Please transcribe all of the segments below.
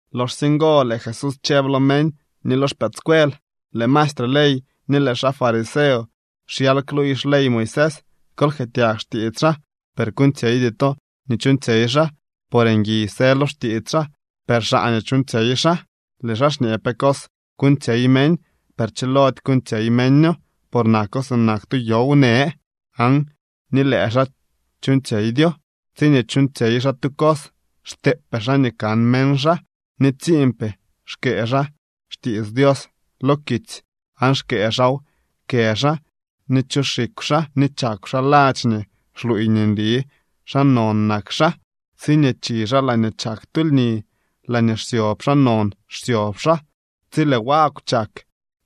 Loxsye ngo lëë Jesús chëb lo meñ ni lo xpëëdscuel: —Lëë maestre ley ni lëë xaa fariseo xyal kluuy xley Moisés. Kol jkëëtyag xtiits xaa. Per kuuñtsyeydy to nii chuuñtsyey xaa, por ngui së lo xtiits xaa, per xaa nii chuuñtsyey xaa. Lëë xaa xñee pe cos kuuñtsyey meñ, per chilody kuuñtsyey meño, por nako sinak tu yow në, aan ni lëë xaa chuuñtsyeydyo. Tsiñee chuuñtsyey xaa tu cos xteepee xaa nii kan meñ xaa, ni tsiinpee xkëë xaa xtiits Dios lo kitsy aan xkëë xaaw kë xaa ni chu xikw xaa nii chakw xaa ladx nii xluuy nii nli xaa non nak xaa. Tsiñee chi xaa laañee chak tu lni, laañee xsyob xaa non xsyob xaa tsi lëë wagw chak,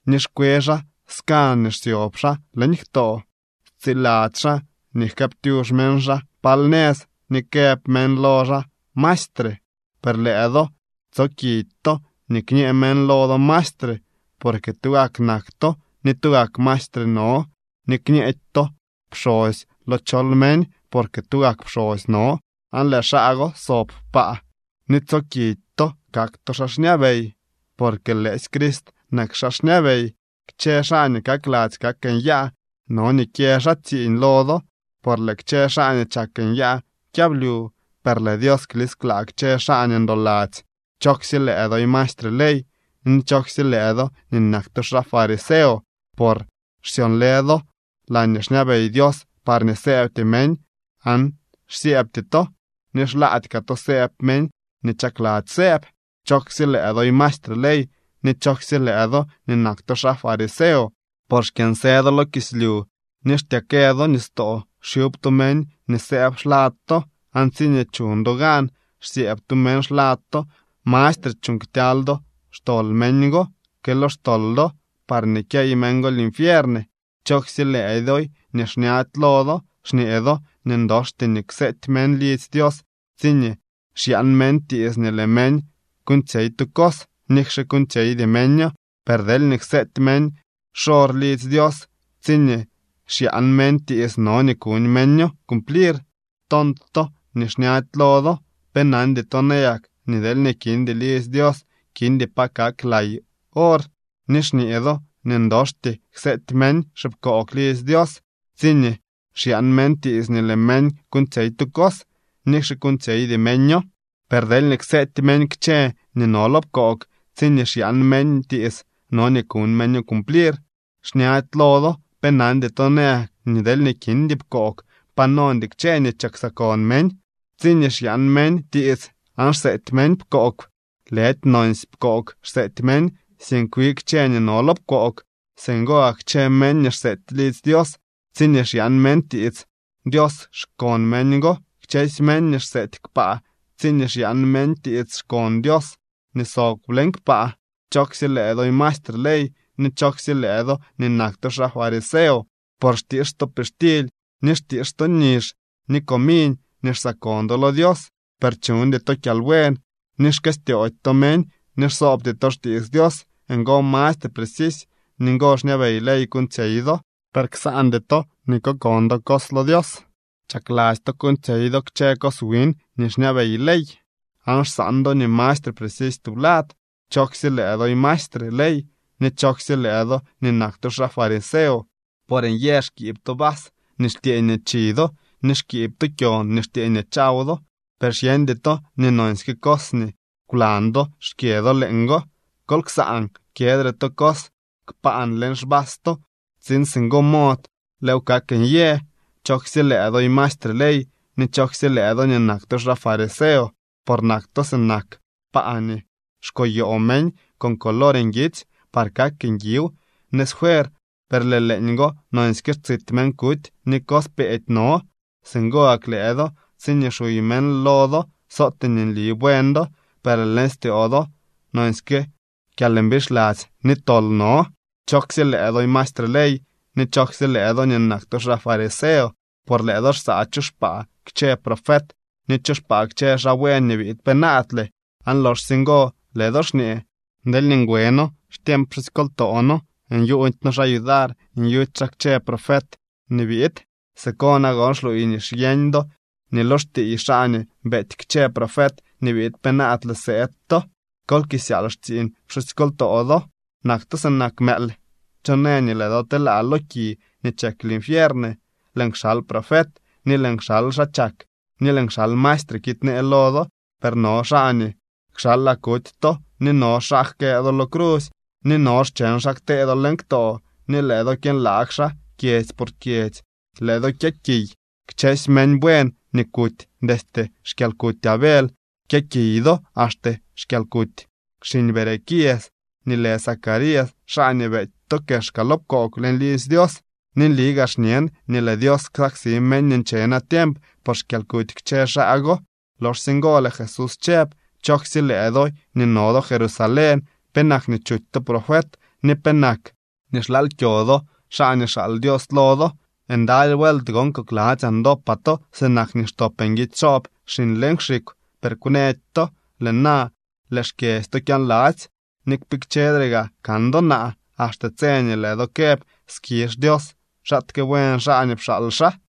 ni xkwe xaa skan nii xsyob xaa leñ ktoo. Stsiladzy xaa nii jkëëptyux meñ xaa pal nëz ni këb meñ lo xaa maestre. ’Per lëë do tsookidy to nii kñë meñ lo do maestre, porque tugak nak to, ni tugak maestre no. Ni kñeedy to pxosy lo chol meñ, porque tugak pxosy no aan lëë xaa go sob kpaa. Ni tsookidy to kak to xaa xñabey, por lëësy Crist nak xaa xñabey. Kchë xaa nii kakladzy kak nyaa no nii kyë xaa tsiiñ lo do. Por lëë kchë xaa nii chak nyaa kyablyu. Per lëë Dios klisklaa kchë xaa nii ndoladzy. ’¡Chooksye lëë doy maestre ley ni chooksye lëë do nii nak to xaa fariseo!, por xsyonlë do laañee xñabey Dios parñee sëëbty meñ aan xsyëëbty to, ni xlaady kaa to sëëb meñ nii chakladzy sëëb. ’¡Chooksye lëë doy maestre ley ni chooksye lëë do nii nak to xaa fariseo!, por xkyënsë do lo kislyu ni xtyeekë do nistoo xyub to meñ nii sëëb xlad to, aan tsiñee chuñ do gan xsyëëb tu meñ xlad to, mastre chuuñ ktyaly do xtol meñ go que lo xtol do, parñee kyey meñ go linfiern. ’¡Chooksye lëëdoy nii xñady lo do! Xñee do nii ndoxty nii kseety meñ lidzy Dios tsiñee xyaan meñ tiits nii lëë meñ kuuñtsyey tu cos nikxe kuuñtsyeydy meño, per deelñee kseety meñ xor lidzy Dios tsiñee xyaan meñ tiits no nii kuñ meño cumplir. ¡Tont to ni xñady lo do! ¿Pe nandy to nayak nii deelñee kindy lidzy Dios, kindy pa kak lay or? Ni xñee do nii ndoxty kseety meñ xipkoog lidzy Dios tsiñee xyaan meñ tiits nii lëë meñ kuuñtsyey tu cos, nikxe kuuñtsyeydy meño. Per deelñee kseety meñ kchë nii no lo pkoog tsiñee xyaan meñ tiits, no nii kuñ meño cumplir. ¡Xñady lo do! ¿Pe nandy to nayak nii deelñee kindy pkoog, pa nondy kchë nii chiksakon meñ? Tsiñee xyaan meñ tiits aan xseety pkoog, lëdy nonsy pkoog xseety meñ, sink wi kchë nii no lo pkoog. Singo gak kchë meñ nii xseety lidzy Dios tsiñee xyaan meñ tiits, Dios xkon meñ go. Kchësy meñ nii xseety kpaa tsiñee xyaan meñ tiits xkon Dios nii sob leñ kpaa. ’¡Chooksye lëë doy mastre ley ni chooksye lëë do nii nak to xaa fariseo!, por xtiix to pixtily, ni xtiix to nizh ni comiñ nii xsaakon do lo Dios, per chuñdy to kyalbuen, ni xkëstyoody to meñ ni xsoobty to xtiits Dios. Ngo mastre precisy ni ngo xñabey ley kuuñtsyey do, per ksaandy to nii kokon do cos lo Dios. Chakladzy to kuuñtsyey do kchë cos wiñ nii xñabey ley aan xsaan do nii mastre precisy tublad. ’¡Chooksye lëë doy maestre ley ni chooksye lëë do nii nak to xaa fariseo!, por nyë xkiib to vas nii xtyëë nii chi do ni xkiib to kyon nii xtyëë nii chaw do, per xyeñdy to nii nonsyke cos nii kwlan do xkyë do leeñgo. Kol ksaan kyëdre to cos kpaan leñ xvas to, tsiin singo mod lëëw kak nyë. ’¡Chooksye lëë doy maestre ley ni chooksye lëë do nii nak to xaa fariseo!, por nak to sinak paa nii xkoyoo meñ con color nguitsy par kak nguiw nëz fuer, per lëë leeñgo nonsyke xtsit meñ kuty ni cos peedy no. Singo gak lëë do tsiñee xuy meñ lo do, sootee nli buen do, per lëë leñ styoo do nonsyke kyalmbixladzy ni tol no. ’¡Chooksye lëë doy maestre ley ni chooksye lëë do nii nak to xaa fariseo!, por lëë do xsaa chu xpaa kchë profet ni chu xpaa kchë xaa buen nii biid penaadle. Aan loxsye ngo lëë do xñee: “Deelñee ngwe noo xtiemp pxusykoltoo noo, nyuuñdy noo xaa yudar nyuty xaa kchë profet nii biid.” Siko nagon xluuy nii xyeñ do nii lo xtiiy xaa nii beety kchë profet nii biid penaadle sëëd to. ¡Kol kisyaal xtsiiñ pxusykoltoo do! ’¡Nak to sinak mëël! ¿Cho në nii lëë do telaa lo ki nii chek linfiern? Lëën kxal profet, ni lëën kxal xaa chak, ni lëën kxal maestre kiidnee lo do, per no xaa nii kxalaa kuty to, ni no xaa jkëë do lo crusy, ni no xcheñ xaa ktee do leñ ktoo ni lëë do kyënlaag xaa kyedzy por kyedzy. Lëë do kyëkiy kchësy meñ buen nii kuty. Destye xkyalkuty Abel kyëkiy do axte xkyalkuty xiñ Berequias nii lë Zacarías xaa nii beety to kexka lo pkoog leñ lidzy Dios. Ni nli xñen nii lëë Dios ksaksi meñ nii nche natiemp por xkyalkuty kchë xaa go. Loxsye ngo lëë Jesús chëb: —¡Chooksye lëë doy nii no do Jerusalén! ¿Penak nii chuty to profet ni penak nii xlaal kyo do xaa nii xaal Dios lo do? ¡Ndaly vuelt gon kokladzyaa ndopaa to sinak nii xtop nguidy xoob xiñ leñ xikw, per kwnëdy to! Lëë na lëë xkyedzy to kyaanladzy. Ni kpikchedre gaa kan do naa, axte tse nii lëë do këb: “Skizh Dios, xaatke buen xaa nii pxaal xaa.”